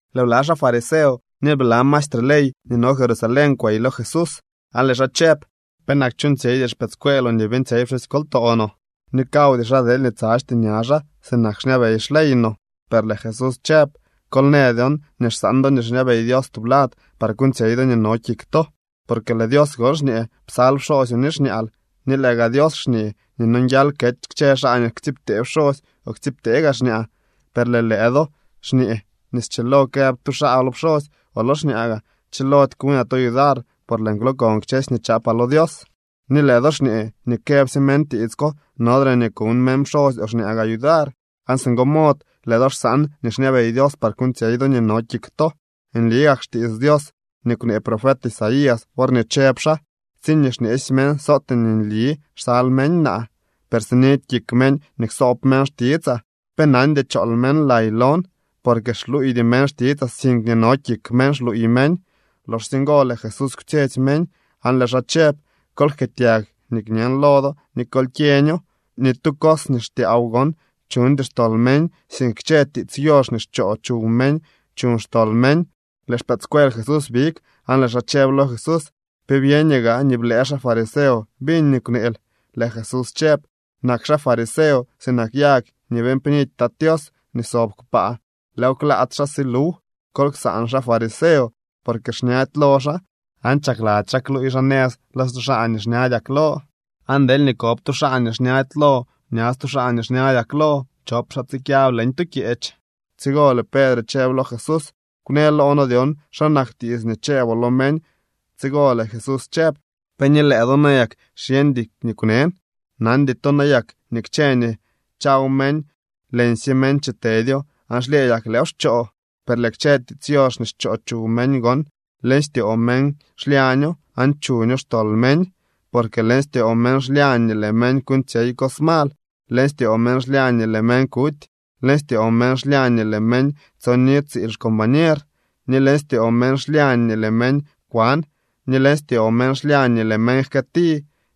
Lëë bla xaa fariseo ni lëë bla maestre ley nii no Jerusalén kwey lo Jesús, aan lëë xaa chëb: —¿Penak chuuñtsyeydy xpëëdscueeloo nii beeñtsyey pxusykoltoo no nii kawdy xaa deelñee tsadxty ña xaa sinak xñabey xley no? Per lëë Jesús chëb: —Kol në dyon nii xsaan do nii xñabey Dios tublad par kuuñtsyey do nii no kik to. Porque lëë Dios gon xñee: “Psal pxoosyoo ni xñaal.” Ni lëë gaa Dios xñee nii nonguial kety kchë xaa nii ktsiibtee pxosy o ktsiibtee gaa xñaa. Per lëë do xñee nii schilo këb tu xaa lo pxosy o lo xñaa gaa: “Chilody kuñaa to yudar, por lëën kwlookon kchësy nii chaapaa lo Dios.” Ni lëë do xñee nii këbsye meñ tiits ko nodre nii kuñ meñ pxosy o xñaa gaa yudar. Aan singo mod lëë do xsaan nii xñabey Dios par kuuñtsyey do nii no kik to. Nli gak xtiits Dios nii kwnee profet Isaías worñee chëb xaa: Tsiñee xñeesy meñ sootee nli nii xsal meñ naa, per sinidy kik meñ nii ksoob meñ xtitsaa. Pe nandy chool meñ lay lon, porque xluuydy meñ xtitsaa, sink nii no kik meñ xluuy meñ. Loxsye ngo lëë Jesús kwtsyetsy meñ aan lëë xaa chëb: —Kol jkëëtyag nii kñen lo do ni kol kyeño: Ni tu cos nii xtyaaw gon chuñdy xtol meñ, sink kchë tiits yox nii xchoo chuw meñ chuñ xtol meñ. Lëë xpëëdscuel Jesús big aan lëë xaa chëb lo Jesús: —¿Pe byeñoo gaa nii blëë xaa fariseo biñ nii kwneel? Lëë Jesús chëb: —Nak xaa fariseo sinak yag nii beeñ pnidy Tat Tios nii sob kpaa, lëëw klaats xaa si luw. Kol ksaan xaa fariseo, por xñady lo xaa aan chakladzy xaa kluuy xaa nëz lo stu xaa nii xñadyak lo. Aan deelñee kob tu xaa nii xñady lo ña stu xaa nii xñadyak lo chop xaa tsikyab leñ tu kyeech. Tsigo lëë Pedre chëb lo Jesús: —Kwnë loo noo dyon xa nak tiits nii chëëboo lo meñ. Tsigo lëë Jesús chëb: —¿Pe ni lëë do nayak xyeñdy nii kwnen? ¿Nandy to nayak nii kchë nii chaw meñ, leñsye meñ chitedyo aan xlyëëdyak lëëw xchoo? Per lëë kchë tiits yox nii xchoo chuw meñ gon, leñ styoo meñ xlyaño, aan chuño xtol meñ. Porque leñ styoo meñ xlyañ nii lëë meñ kuuñtsyey cos mal, leñ styoo meñ xlyañ nii lëë meñ kuty, leñ styoo meñ xlyañ nii lëë meñ tsoni tsiil xcombañer, ni leñ styoo meñ xlyañ nii lëë meñ kwan, ni leñ styoo meñ xlyañ nii lëë meñ jkëëti,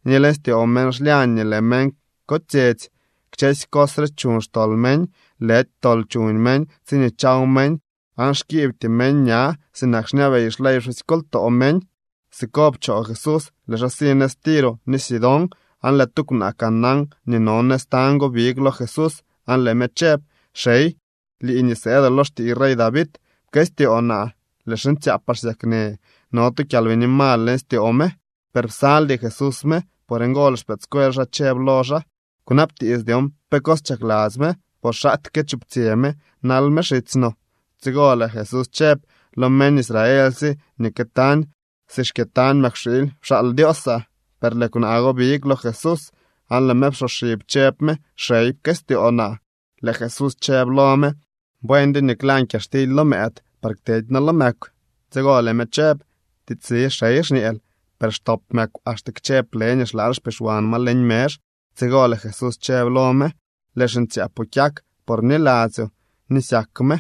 ni leñ styoo meñ xlyañ nii lëë meñ kotsyetsy. Kchësy cos re chuñ xtol meñ. Lëdy tol chuñ meñ tsiñee chaw meñ aan xkiibty meñ ña sinak xñabey xley pxusykoltoo meñ. Siko pchoo Jesús, lëë xaa si nëz Tiro ni Sidón. Aan lëë tu kwnaa Canaán nii no nëz tañ go big lo Jesús aan lëë me chëb: —¡Xey, lii nii sëëdoo lo xtiiy rey David, pkëstyoo naa! Lëë xiñtsyaapaa xsyaknë. No tu kyalbini mal leñ styoo me. Per psaldy Jesús me. Por ngo lëë xpëëdscuel xaa chëb lo xaa: —Kwnabtiits dyon pe cos chakladzy me, por xaktyee chuptsyë me nal me xitsy no. Tsigo lëë Jesús chëb: —Lo meñ Israelsye nii këtañ si xkyëtañ mëkwxiily pxaal Dioosaa. Per lëë kwnaa go big lo Jesús aan lëë me psoxib chëb me: —¡Xey, pkëstyoo naa! Lëë Jesús chëb lo me: —Buendyo nii klan kyaxtily lo mëëd par kteedy noo lo mëkw. Tsigo lëë me chëb: —Tiitsli, xey, xñeel, per xtop mëkw axte kchë plë nii xlaal xpixwan ma leñ mezh. Tsigo lëë Jesús chëb lo me: —Lëë xiñtsyaapoo kyak, por bniladzyoo nii syak me.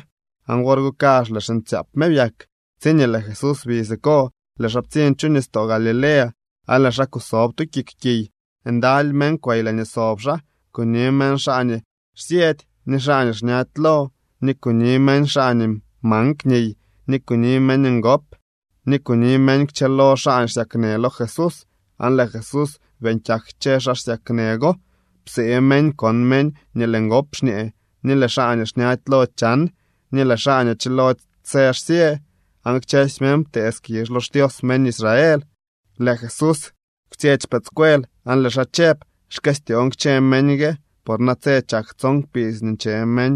Aan wor go kazh lëë xiñtsyaap me byak. Tsiñee lëë Jesús bi siko lëë xaa ptsiñ chu nistoo Galilea aan lëë xaa kusob tu kik kiy. Ndaly meñ kwey laañee sob xaa. Kuni meñ xaa nii xsyëdy ni xaa nii xñady lo, ni kuni meñ xaa nii mank niy, ni kuni meñ ngop, ni kuni meñ kchëlo xaa xsyaknë lo Jesús aan lëë Jesús beeñ kyak kchë xaa xsyaknë go. Psee meñ kon meñ nii lëë ngop xñee, ni lëë xaa nii xñady lo chan, ni lëë xaa nii chilody së xsyë. Aan kchësy meñ ptee skizh lo xDios meñ Israel. Lëë Jesús kwtsyetsy xpëëdscuel aan lëë xaa chëb: —Xkëstyoon kchë meñ gue, por natse chak tson kpidz nii nche meñ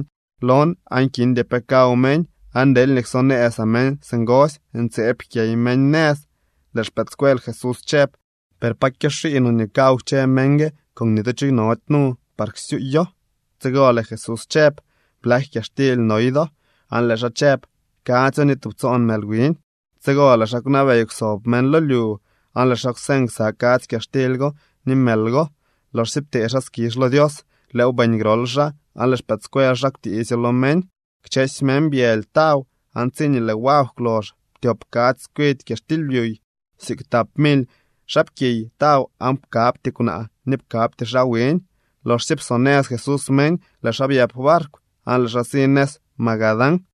lon aan kindy pe kaw meñ. Aan deelñee ksonëzaa meñ singosy, ntseeb jkyey meñ nëz. Lëë xpëëdscuel Jesús chëb: —Per ¿pa kyoxii no nii kaw kchë meñ gue, con ni tu cho nody nu par ksyuuyo? Tsigo lëë Jesús chëb: —¿Blak kyaxtily noy do? Aan lëë xaa chëb: —Kadzyo, ni tubtsoon mël wiñ. Tsigo lëë xaa kwnabey kwsob meñ lo lyu. Aan lëë xaa kwseñ ksa kadzy kyaxtily go ni mël go. Loxsye ptee xaa skizh lo Dios, lëëw beeñ grol xaa, aan lëë xpëëdscuel xaa kwtiisyo lo meñ. Kchësy meñ byëly taw aan tsiñee lëë wagw kwlox ptyop kadzy tskwidy kyaxtily byuy. Siik tap mily xaapkiy taw aan pkabty kwnaa ni pkabty xaa wiñ. Loxsye psonëz Jesús meñ, lëë xaa byëp barkw aan lëë xaa si nëz Magadán.